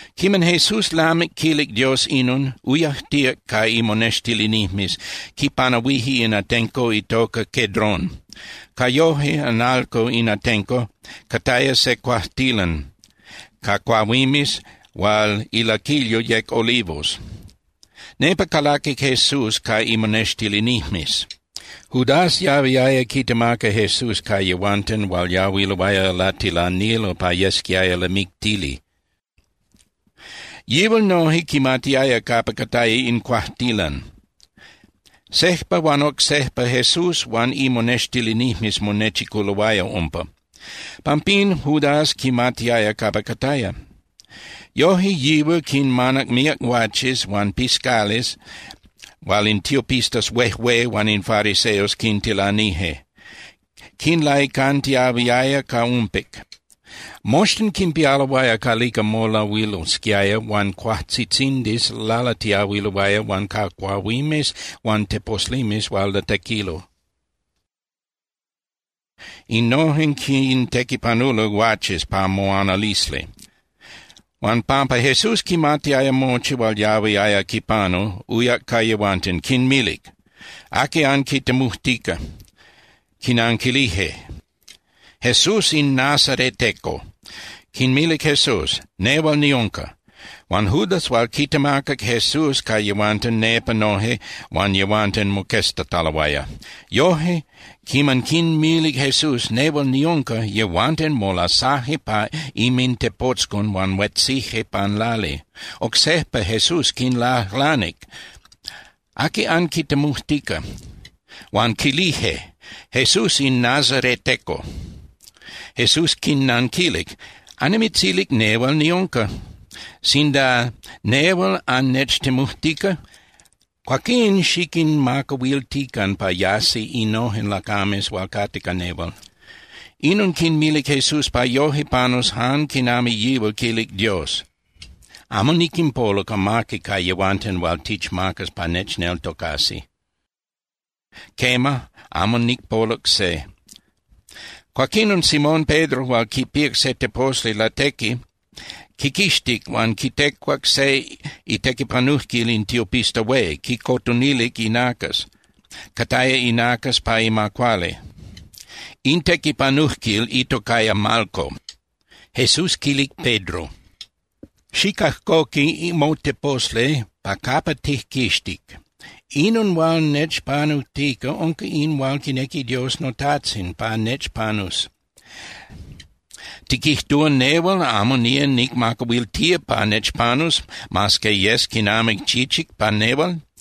Quiman Jesús lamic quilic Dios inon, uyajtíac ca imonextilinijmes, quipanahuije in atenco itoca Cedrón. Ca yoje (analco) in atenco cataya se cuajtilan ca cuahuimes hual ilaquilyo yec olivos. Nepa calaquic Jesús ca imonextilinijmes. Judas yahuiaya quitemaca Jesús ca yehuanten hual yahuiloaya latilanilo pa yesquiaya lamictili. Yihual noje quimatiaya capa cataya in cuajtilan. Sejpa huan oc sejpa Jesús huan imonextilinijmes monechiculoaya umpa. Pampín Judas quimatiaya capa cataya. Yoje yihual quinmanac míac guaches huan piscales hual in tiopistas huejué huan in fariseos quintilanije, quinlaicantiahuiaya ca umpic. Moxtin quinpialoaya calica molahuilosquiaya huan cuajtzitzindis lalatiahuiloaya huan ca cuahuimes huan teposlimes hual latequilo. Innojen quintequipanulo guaches pa moanalisli. Huan pampa Jesús quimatiaya mochi hual yahuiaya quipanu, uyac ca yehuanten, quinmilic: —¿Aqui anquitemujtica? Quinanquilije: —Jesús in nazareteco. Quinmilic Jesús: —Nehual niunca. Huan Judas hual quitemacac Jesús ca yehuanten nepa noje huan yehuanten moqueztataloaya. Yoje, quiman quinmilic Jesús: “Nehual niunca”, yehuanten molasaje pa inmintepotzcon huan huetzije pan lali. Oc sejpa Jesús quinlajlanic: —¿Aqui anquitemujtica? Huan quilije: —Jesús in nazareteco. Jesús quinnanquilic: —Annimitzilic nehual niunca. Sinda nehual annechtemujtica, cuaquín xiquinmacahuiltican pa yasi innojen lacames hual cate ca nehual. Inon quinmilic Jesús pa yoje panus jan quinami yihual quilic Dios: “Amo niquinpoluc amaqui ca yehuanten hual tichmacac pa nechneltocasi. Quema, amo nicpoluc se.” Cuaquinon Simón Pedro hual quipíac se teposli latequi quiquixtic huan quitecuac se itequipanujquil in tiopista hué, quicotonilic inacas, cataya inacas pa ima cuali. In tequipanujquil itocaya Malco. Jesús quilic Pedro: —Xicajcoqui moteposli pa capa tijquixtic. Inon hual nechpanujtica unca in hual quinequi Dios noTajtzin pa nechpanus. ¿Tiquijtúa nehual amo nía nicmacahuiltía pa nechpanus mas que yes quinami chichic pa nehual?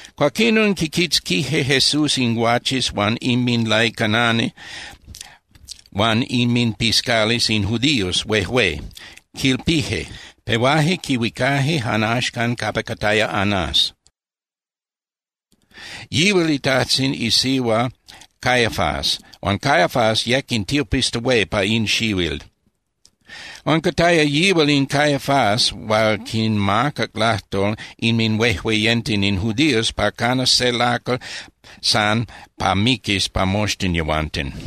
Cuaquinon quiquitzquije Jesús in guaches huan inminlaicanani huan inminpiscales in judíos huejué, quilpije. Pehuaje quihuicaje jan axcan capa cataya Anás, yihual itajtzin isihua Caifás huan Caifás yec in tiopista hué pa in xihuil. Huan cataya yihual in Caifás hual quinmacac lajtol inminhuejueyenten in judíos pa canas se lacal san pa miquis pa moxtin yehuanten.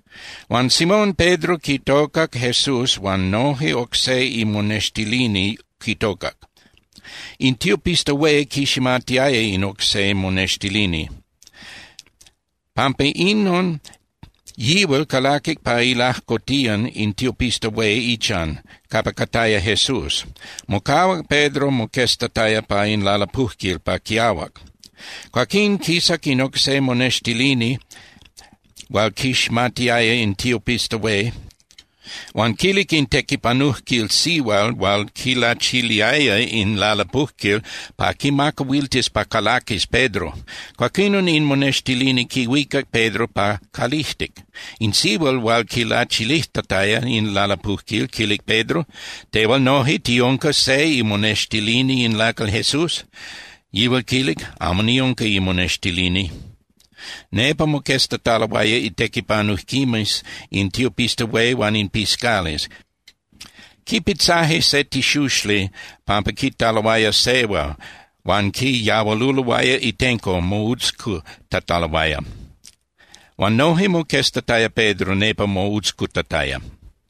Huan Simón Pedro quitocac Jesús huan noje oc se imonextilini quitocac. In tiopista hué quiximatiaya in oc se monextilini. Pampa inon yihual calaquic pa ilajcotiyan in tiopista hué ichan, capa cataya Jesús. Mocahuac Pedro moqueztataya pa in lalapujquil pa quiahuac. Cuaquín quisac in oc se monextilini hual quiximatiaya in tiopista hué, huan quilic in tequipanujquil sihual hual quilachiliaya in lalapujquil pa quimacahuiltis pa calaquis Pedro. Cuaquinon in monextilini quihuicac Pedro pa calijtic. In sihual hual quilachilijtataya in lalapujquil quilic Pedro: —Tehual noje, ¿tiunca se imonextilini in lacal Jesús? Yihual quilic: —Amo niunca imonextilini. Nepa moqueztataloaya itequipanujquimes in tiopista hué huan in piscales. Quipitzaje se tixuxli pampa quitaloaya sehua huan quiyahualuloaya itenco moutzcutataloaya. Huan noje moqueztataya Pedro nepa moutzcutataya.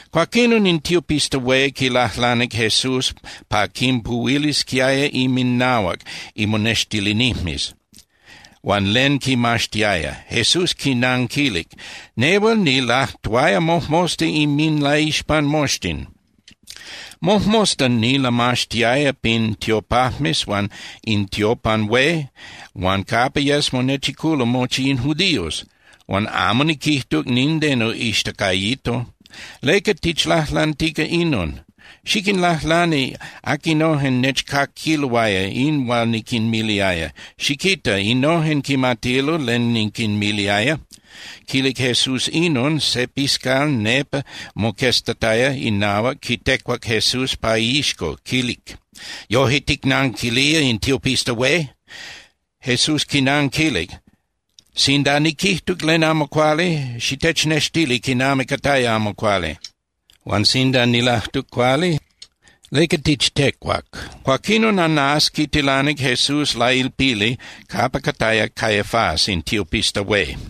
Cuaquinon in tiopista hué quilajlanic Jesús pa quinpuhuilisquiaya inminahuac imonextilinijmes huan len quimaxtiaya. Jesús quinanquilic: —Nehual nilajtuaya mojmosta inminlaixpan moxtin. Mojmosta nilamaxtiaya pin tiopajmes huan in tiopan hué huan capa yes monechiculo mochi in judíos, huan amo niquijtuc nindeno ixtacayito. ¿Leca tichlajlantica inon? Xiquinlajlani aquinojen nechcaquiloaya in hual niquinmiliaya. Xiquita, innojen quimatilo len niquinmiliaya. Quilic Jesús inon, se piscal nepa moqueztataya inahuac quitecuac Jesús pa iixco, quilic: —¿Yoje ticnanquilía in tiopista hué? Jesús quinanquilic: —Sinda niquijtuc len amo cuali, xitechnextili quinami cataya amo cuali. Huan sinda nilajtuc cuali, ¿leca tichtecuac? Cuaquinon Anás quitilanic Jesús lailpili capa cataya Caifás in tiopista hué.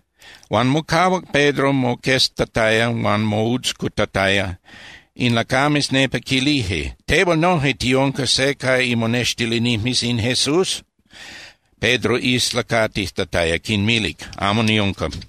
Huan mocahuac Pedro moqueztataya huan moutzcutataya. In lacames nepa quilije: —¿Tehual noje tiunca se ca imonextilinijmes in Jesús? Pedro islacatijtataya quinmilic: —Amo niunca.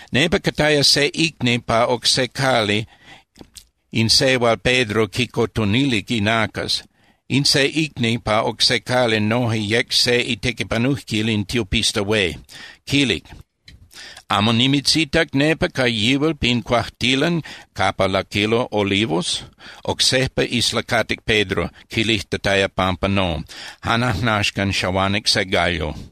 Nepa cataya se icni pa oc se cali in se hual Pedro quicotonilic inacas, in se icni pa oc se cali noje yec se itequipanujquil in tiopista hué, quilic: —¿Amo nimitzitac nepa ca yihual pin cuajtilan capa laquilo olivos? Oc sejpa islacatic Pedro quilijtataya pampa no. Jan ajnaxcan xahuanic se gallo.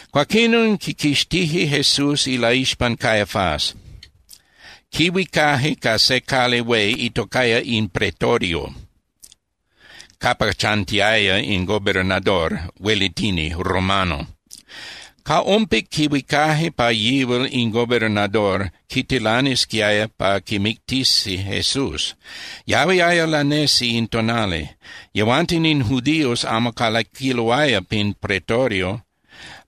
Cuaquinon quiquixtije Jesús ilaixpan Caifás, quihuicaje ca se cali hué itocaya in Pretorio capa chantiaya in gobernador (huelitini) romano. Ca ompic quihuicaje pa yihual in gobernador quitilanisquiaya pa quimictisi Jesús. Yahuiaya lanesi in tonali. Yehuanten in judíos amo calaquiloaya pin Pretorio,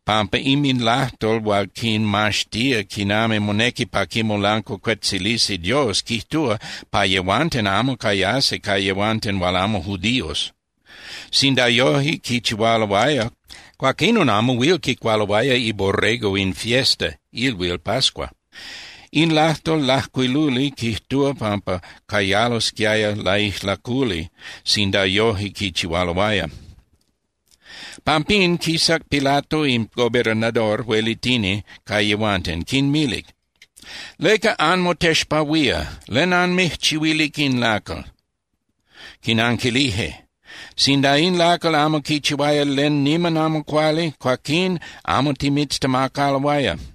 pampa inminlajtol hual quinmaxtía quinami monequi pa quimolancuacuetzilisi Dios quijtúa pa yehuanten amo cayasi ca yehuanten hual amo judíos. Sinda yoje quichihualoaya, cuaquinon amo huil quicualoaya iborrego in fiesta (ilhuil) pascua. In lajtol lajcuiluli quijtúa pampa cayalosquiaya laijlaculi sinda yoje quichihualoaya. Pampín, quisac Pilato in gobernador (huelitini) ca yehuanten, quinmilic: —¿Leca anmotexpahuía? ¿Len anmijchihuilic in lacal? Quinanquilije: —Sinda in lacal amo quichihuaya len niman amo cuali, cuaquín amo timitztemacaloaya.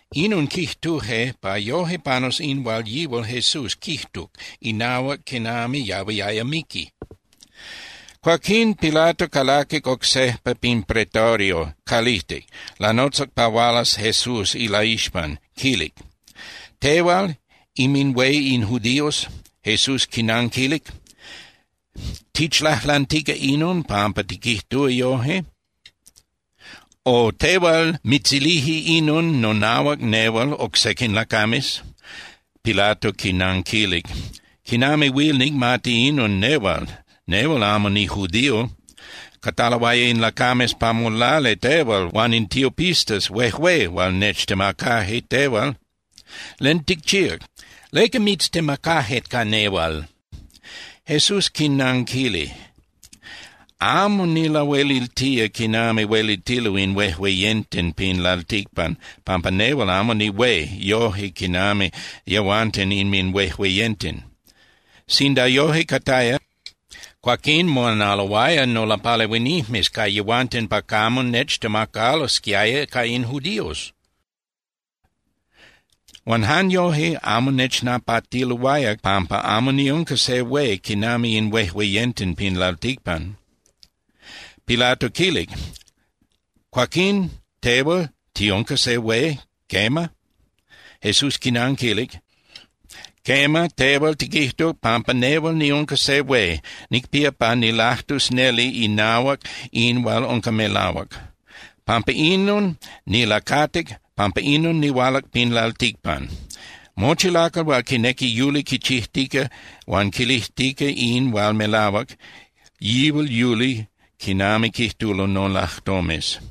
Inon quijtuje pa yoje panus in hual yihual Jesús quijtuc inahuac quinami yahuiaya miqui. Cuaquín Pilato calaquic oc sejpa pin Pretorio calijtic, lanotzac pa hualas Jesús ilaixpan, quilic: —¿Tehual inminhué in judíos? Jesús quinanquilic: —¿Tichlajlantica inon pampa tiquijtúa yoje? O ¿tehual mitzilije inon nonahuac nehual oc sequin lacames? Pilato quinanquilic: —¿Quinami huil nicmati inon nehual? Nehual amo nijudío. Cataloaya in lacames pa molali tehual huan in tiopistas huejué hual nechtemacaje tehual. ¿Len ticchíac? ¿Leca mitztemacaje ca nehual? Jesús quinanquilic: —Amo nilahueliltía quinami huelitilo in huejueyenten pin lalticpan pampa nehual amo nihué yoje quinami yehuanten inminhuejueyenten. Sinda yoje cataya, cuaquín moanaloaya nolapalehuinijmes ca yehuanten pa camo nechtemacalosquiaya ca in judíos. Huan jan yoje, amo nechnapatiloaya pampa amo niunca se hué quinami in huejueyenten pin lalticpan. Pilato quilic: —Cuaquín, tehual tiunca se hué, ¿quema? Jesús quinanquilic: —Quema, tehual tiquijtuc pampa nehual niunca se hué. Nicpía pa nilajtus neli inahuac in hual unca melahuac. Pampa inon nilacatic, pampa inon nihualac pin lalticpan. Mochi lacal hual quinequi yuli quichijtica huan quilijtica in hual melahuac, yihual yuli quinami quijtulo nolajtomes.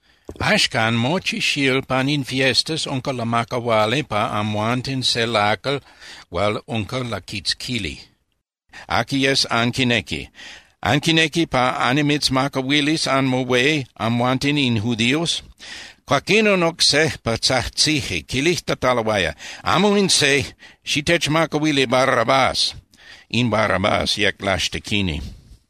Axcan, mochi xíl pan in fiestas unca lamacahuali pa amhuanten se lacal hual unca laquitzquili, aqui yes anquinequi. ¿Anquinequi pa annimitzmacahuilis anmohué amhuanten in judíos? Cuaquinon oc sejpa tzajtzije, quilijtataloaya: —¡Amo in se! ¡Xitechmacahuili Barrabás! In Barrabás yec laxtequini.